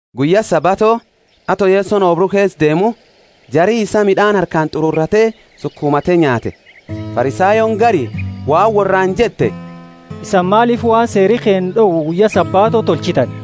Guyya Sabato, ato Yesoni oobru keesa deemu, jari isaa mid'aani harkaani t'ururate sukumate nyaate. Farisayooni gari waan worraani jette, Isani maalifi waan Seeri keenna d'owu guyya Sabato tolchitani?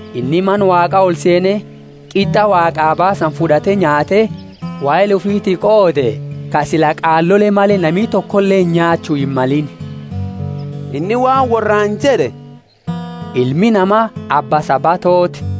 Inni Mana Waaqa oli seene, qit'a Waaqaa baasani fud'ate nyaate wahela ufiti qoode, ka sila qaalole male nami tokoleeni nyaachu himmalini. Inni waan worraani jed'e, Ilmi Nama abba Sabatooti.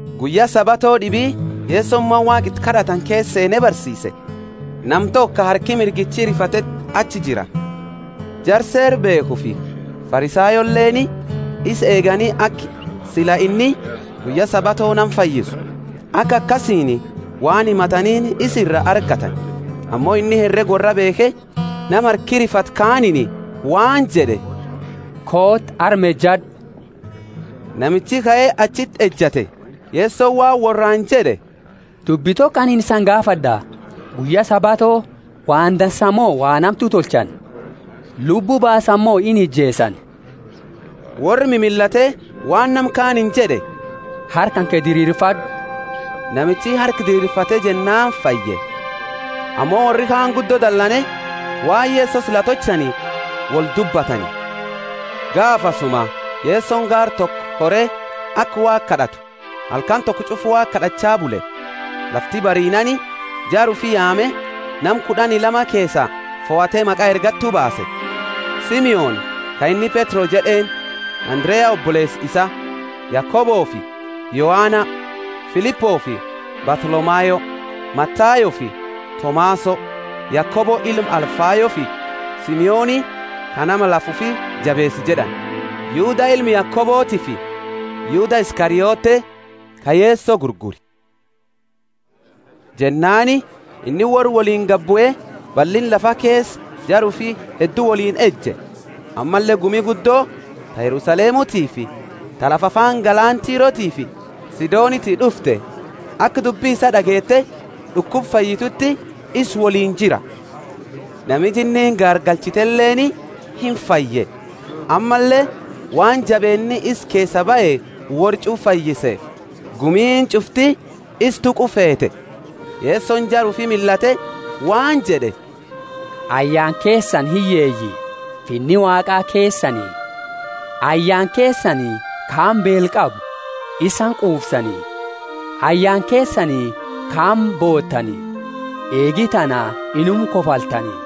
Guyya Sabato d'ibi Yesoni mana Waaqa iti kad'atani keesa seene barsiise. Nama toko ka harki mirgichi rifateti achi jira. Jara Seera beekhufi Farisayooleeni isa eegani aka sila inni guyya Sabato nama fayyisu, aka akasiini waan himataniini isa ira argatani. Ammo inni herega worraa beekhe, nama harki rifate kaaniini waan jed'e, Kooti, arma ejad'u. Namichi kae achiti ejate. Yesoni waan worraani jed'e, Dubbi toko anini isani gaafad'a: Guyya Sabato waan dansa mo waan hamtu tolchani? Lubbu baasani mo inijeesani? Worra mimillate waan nama kaaniini jed'e, Harka kanke diriirfad'u Namicha harka diriirfate jennaani fayye. Ammo worri kaani guddo dalane waan Yeso sila tolchani woldubbatani. Gaafasuma Yesoni gaara toko kore aka Waaqa kad'atu, halkani toko ch'ufa Waaqa kad'acha bule. Lafti bariinaani jara ufi yaame, nama kud'ani lama keesaa fohate maqa ergattu baase: Simoni (ka inni Petro jed'eeni), Andarea oboleesa isaa, Yakobofi Yohana, Filipofi Bartholomayo, Matayofi Tomaso, Yakobo ilma Alfayofi Simoni ka nama lafa ufi jabeesu jed'ani, Yuda ilma Yakobotifi Yuda Iskariote ka Yeso gurgure. Jennaani inni worra woliini gabue ballinna lafa keesa jara ufi heddu woliini eje. Ammalle gumi guddo ta Yerusalemutiifi ta lafa afaani galaana Tirotiifi Sidoniti d'ufte, aka dubbi isaa d'ageete d'ukuba fayyituti isa woliini jira. Nami jinniini gaargalchiteleeni imfaye. Ammalle waan jabeenni isa keesaa bahe worra ch'ufa fayyiseefi gumiini ch'ufti isa tuqu feete. Yesoni jara ufi millate waan jed'e, Ayyaana keesani hiyyeeyi: Finni Waaqa keesani! Ayyaana keesani ka amma beela qabu: isani qufsani! Ayyaana keesani ka amma bootani: eegi tana inuma kofaltani.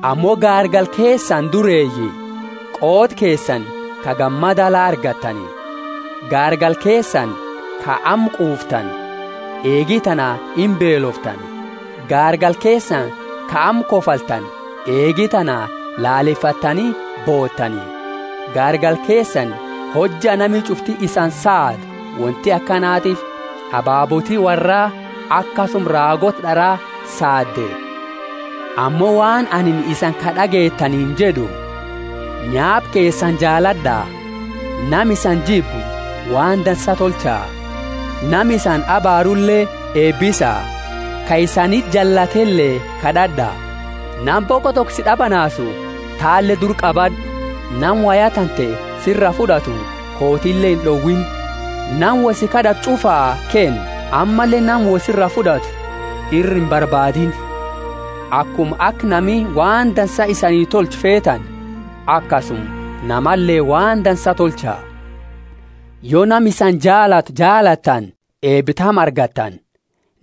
Ammo gaargala keesani dureeyi: qooda keesani ka gammada la argattani. Gaargala keesani ka amma quuftani: eegi tana imbeeloftani. Gaargala keesani ka amma kofaltani: eegi tana laalefattani bootani. Gaargala keesani hojja nami ch'ufti isani saadu; wonti akanatiifi ababooti worraa akasuma raagoota d'ara saade. Ammo waan anini isani ka d'ageetaniini jed'u, Nyaapa keesani jaalad'a, nama isani jibbu waan dansa tolcha, nama isani abaarule eebisa, ka isaniti jallatele kad'ad'a. Nama boqo toko si d'abanaasu tale dura qabad'u; nama woya tante sira fud'atu kootile ind'owiini. Nama woi si kad'atu ch'ufaa kenni, ammalle nama wo sira fud'atu ira imbarbaadiini. Akuma aka nami waan dansa isani tolchu feetani, akasuma namale waan dansa tolcha. Yo nama isani jaalatu jaalattani eeba tami argattani?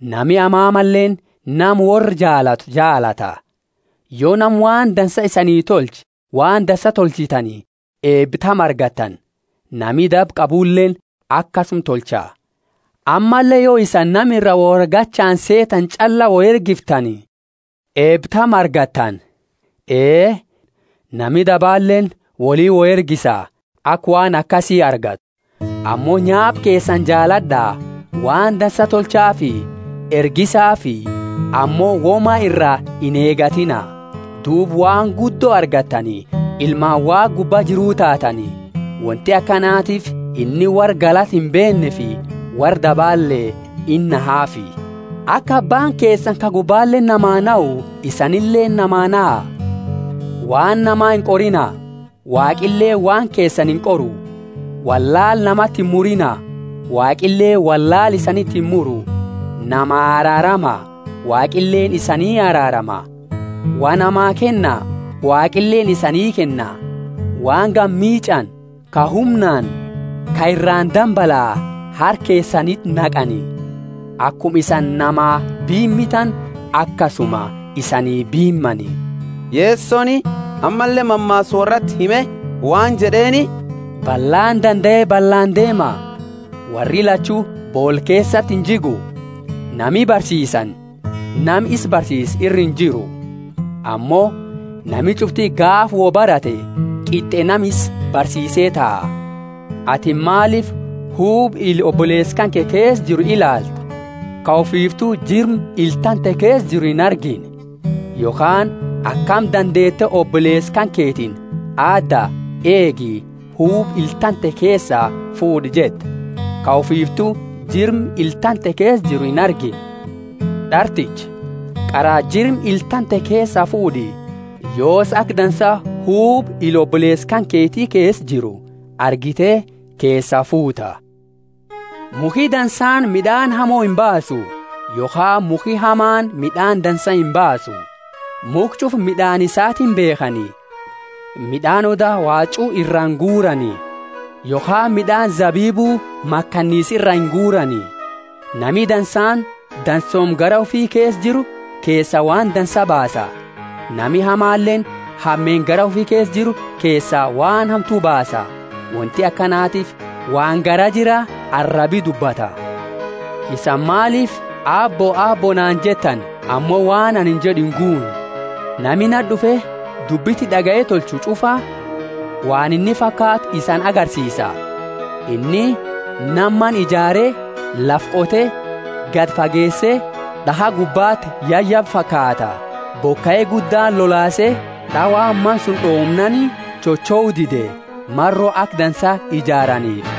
Nami hamamaleeni nama worra jaalatu jaalata. Yo nama waan dansa isani tolche waan dansa tolchitani eeba tami argattani? Nami daba qabuleeni akasuma tolcha. Ammalle yo isani nama iraa woi argachaani seetani ch'allaa woi ergiftani, eeba tami argattani? Ee, nami dabaleeni woli wo ergisa, aka waan akasi argatu. Ammo nyaapa keesani jaalad'a, waan dansa tolchaafi; ergisaafi, ammo woma iraa ineegatiina. Duuba waan guddo argattani, ilmaani Waaqa Gubba Jiru taatani. Wonti akanatiifi inni worra galata imbeenneefi worra dabale inahafi. Aka Abbaani keesani ka gubbaleeni namaa nahu isanileeni namaa naha. Waan nama inqorina, Waaqileeni waan keesani inqoru; wollaala namati imuriina, Waaqileeni wollaala isaniti imuru; namaa araarama, Waaqileeni isanii araarama. Wa namaa kenna, Waaqileeni isanii kenna: waan gamiich'ani, ka humnaani, ka iraani dambalaa, harka keesaniti naqani. Akuma isani namaa biimitani akasuma isanii biimani. Yesoni ammalle mammaasa worrati hime waan jed'eeni, Ballaani dandae ballaani deema? Worri lachu boola keesati injigu? Nami barsiisani nama isa barsiisu ira injiru. Ammo nami ch'ufti gaafa wo barate qit'e nama isa barsiise taha. Atini maalifi huba ila oboleesa kanke keesa jiru ilaalta, ka ufiiftu jirma ila tante keesa jiru inargine? Yokhaani akami dandeete oboleesa kanketiini, Aadda, eegi, huba ila tante keesaa fuud'a jetta, ka ufiiftu jirma ila tante keesa jiru inargine? D'articha, qara jirma ila tante keesaa fuud'i, yoosi aka dansa huba ila oboleesa kanketi keesa jiru argite keesaa fuuta. Mukhi dansaani mid'aani hamo imbaasu, yokhaani mukhi hamaani mid'aani dansa imbaasu. Mukha ch'ufa mid'aani isaatiini beekhani; mid'aani oda waachu iraa inguurani, yokhaani mid'aani zabibu makanisa iraa inguurani. Nami dansaani dansooma garaa ufi keesa jiru keesaa waan dansa baasa; nami hamaleeni hameenna garaa ufi keesa jiru keesaa waan hamtu baasa. Wonti akanatiifi waan garaa jira arabi dubbata. Isani maalifi, Aabbo, Aabbo naani jettani ammo waan anini jed'u inguunne? Nama nati d'ufe dubbi tiyya d'agaye tolchu ch'ufa waan inni fakaatu isani agarsiisa. Inni nama mana ijaare, lafa qote, gadi fageese, d'akha gubbati yayabe fakaata. Bokai guddaani lolaase d'awaani mana suni d'omnaani chochou dide, maro aka dansa ijaaraniifi.